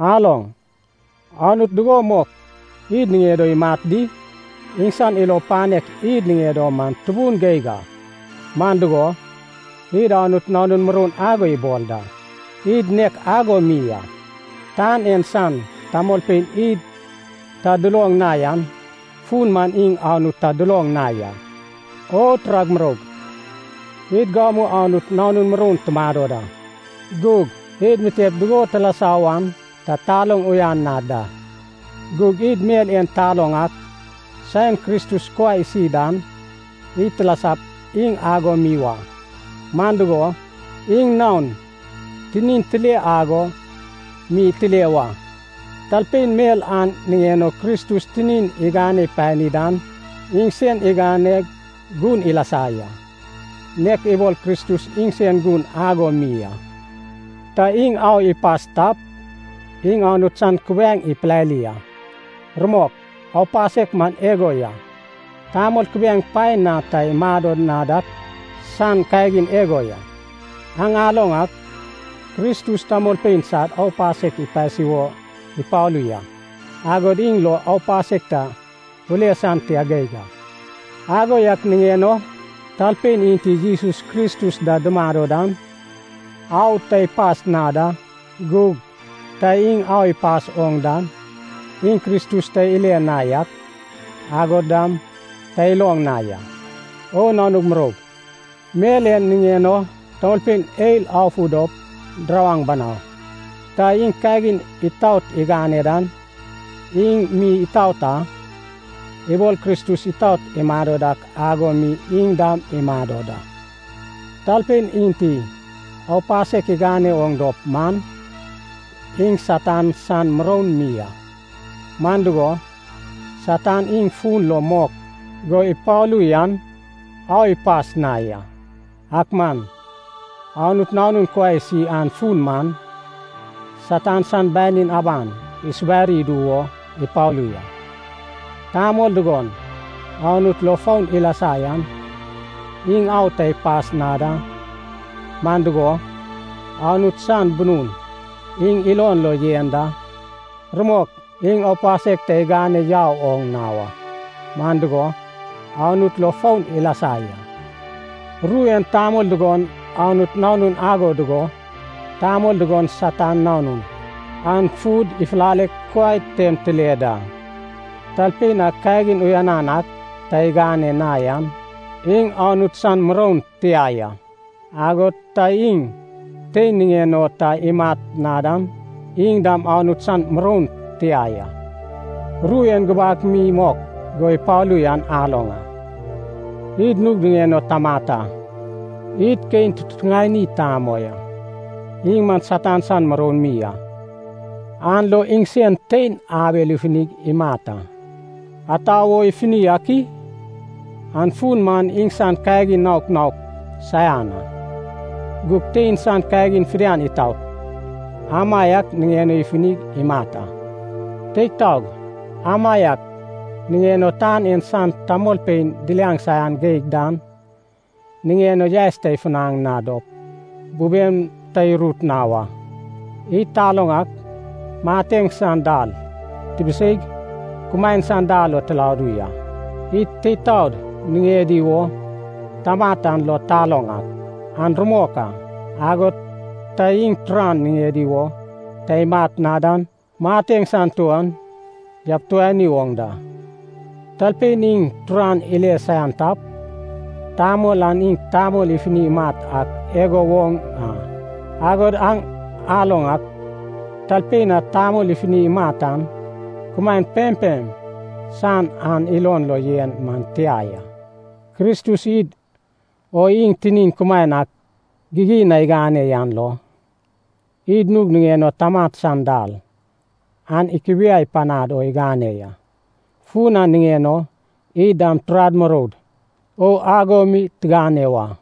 Aloŋ, Anut dugo mok id niŋed o imat di? Iŋsan ilo panek id niŋed o man tubun geig a! Man dugo, id Anut nanun muroun ago ibol da. Id nek ago mi a. Tan en san tamolpein id ta duloŋ na yan fun man iŋ Anut ta duloŋ na ya. O turag muroug! Id gamu Anut nanun muroun tumado da. Gug id mitep dugo tilasa wan ta taloŋ uyan na da. Gug id mel en taloŋ ak, saen Kristus kuai isi dan, id tilasap iŋ ago mi wa. Man dugo, iŋ naon tinin tile ago mi tile wa. Talpein mel an niŋen o Kristus tinin igane pani dan iŋsen iganeg gun ilasa ya, nek ibol Kristus iŋsen gun ago mi a. Ta iŋ au ipas tap, iŋ Anut san kubiaeŋ ipilali a. Rumok, aupasek man igo ya, tamol kubiaeŋ paen na ta imado na dak san kagin igo ya. Aŋ aloŋ ak, Kristus tamolpein sad aupasek ipasi wo ipalu ya. Agod iŋ lo aupasek ta ule san tia geig a. Ago yak niŋen o talpein enti Jesus Kristus da dumado dan au ta ipas na da. Gug ta iŋ au ipas oŋ dan, iŋ Kristus ta ile na yak, agod dam ta iloŋ na ya. O nanug muroug, mel en niŋen o tamolpein eil afu dop dirawaŋ banau! Ta iŋ kagin itaot igane dan, iŋ mi itaot a. Ibol Kristus itaot imado dak ago mi iŋ dam imado da. Talpein enti aupasek igane oŋ dop man, iŋ Satan san muroun mi a. Man dugo, Satan iŋ fun lo mok go ipalu yan au ipas na ya. Ak man Anut Nanun kuai isi an fun man, Satan san banin aban isubari idu wo ipalu ya. Tamol dugon Anut lo foun ilasa yan iŋ au ta ipas na da, man dugo, Anut san bunun iŋ ilon lo yen da. Rumok, iŋ aupasek ta igane yau oŋ na wa, man dugo, Anut lo foun ilasa ya. Ru en tamol dugon Anut nanun ago dugo, tamol dugon Satan nanun, an fud ifulaleg kuai tem tile da. Talpein a kagin uyan ak ta igane na yan iŋ Anut san muroun tia ya. Agod ta iŋ tein niŋen o ta imat na dan iŋ dam Anut san muroun tia ya. Ru en gubak mi mok go ipalu yan aloŋ a, id nug niŋen o tamat a. Id Kein tutuŋani tamoi a. Iŋ man Satan san muroun mi a, an lo iŋsen tein Abel ifunig imat a. Ata wo ifuni ak i? An fun man iŋsan kagin naok naok saian a, gug tein san kagin fidian itaot, amaiak niŋen o ifunig imat a. Teig taog, amaiak niŋen o tan en san tamolpein diliaŋ saian geig dan, niŋen o yaes ta ifunaŋ na dop bubem ta irut na wa. Id taloŋ ak mateŋ san dal tibiseig, kumaen san dal lo tiladu ya. Id teid taod niŋedi wo tamat an lo taloŋ ak, an rumok a. Agod ta iŋ turan niŋedi wo ta imat na dan mateŋ san tuon yabituani oŋ da. Talpein iŋ turan ile saian tap, tamol an iŋ tamol ifuni imat ak igo woŋ a. Agod aŋ aloŋ ak, talpein a tamol ifuni imat an kumaen pempem san an ilon lo yen man tia ya. Kristus id o iŋ tinin kumaen ak gigin na igane yan lo, id nug niŋen o tamat san dal an ikubiai panad o igane ya. Fun an niŋen o id dam turad muroud o ago mi tigane wa.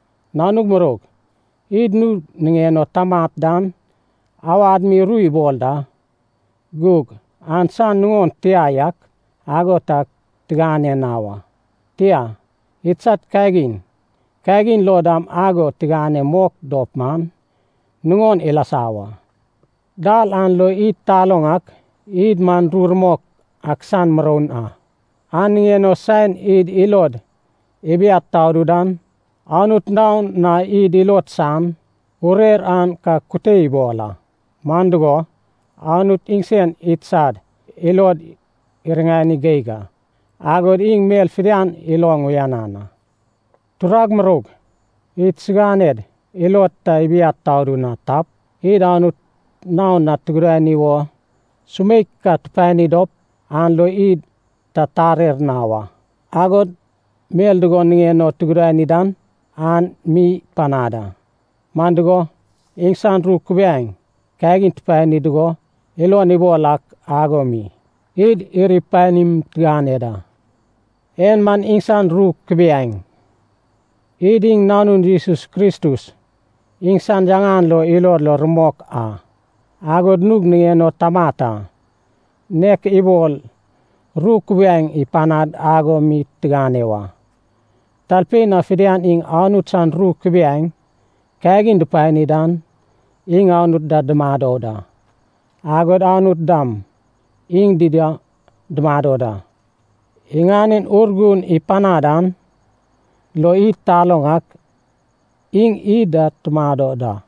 Nanug muroug, id nug niŋen o tamat dan awad mi ru ibol da, gug an san nuŋon tia yak ago ta tigane na wa. Tia, idsad kagin kagin lo dam ago tigane mok dop man, nuŋon ilasa wa. Dal an lo id taloŋ ak id man ru rumok ak san muroun a. An niŋen o saen id ilod ibiad tadu dan, Anut naon na id ilod san urer an ka kute ibol a. Man dugo, Anut iŋsen idsad ilod iriŋani geig a, agod iŋ mel fidian iloŋ uyanan a. Turag muroug, idsiganed ilod ta ibiad tadu na tap, id Anut naon na tugudani wo sumeik ka tupani dop, an lo id ta tarer na wa. Agod mel dugon niŋen o tugudani dan, an mi ipanad a. Man dugo, iŋsan ru kubiaeŋ kagin tupani dugo ilon ibol ak ago mi, id iri panim tigane da. En man iŋsan ru kubiaeŋ, id iŋ Nanun Jesus Kristus iŋsan yaŋan lo ilod lo rumok a, agod nug niŋen o tamat a, nek ibol ru kubiaeŋ ipanad ago mi tigane wa. Talpein a fidian iŋ Anut san ru kubiaeŋ kagin dupani dan, iŋ Anut da dumado da. Agod Anut dam iŋ dida dumado da. Iŋanen Urgun ipanad an lo id taloŋ ak, iŋ id da tumado da.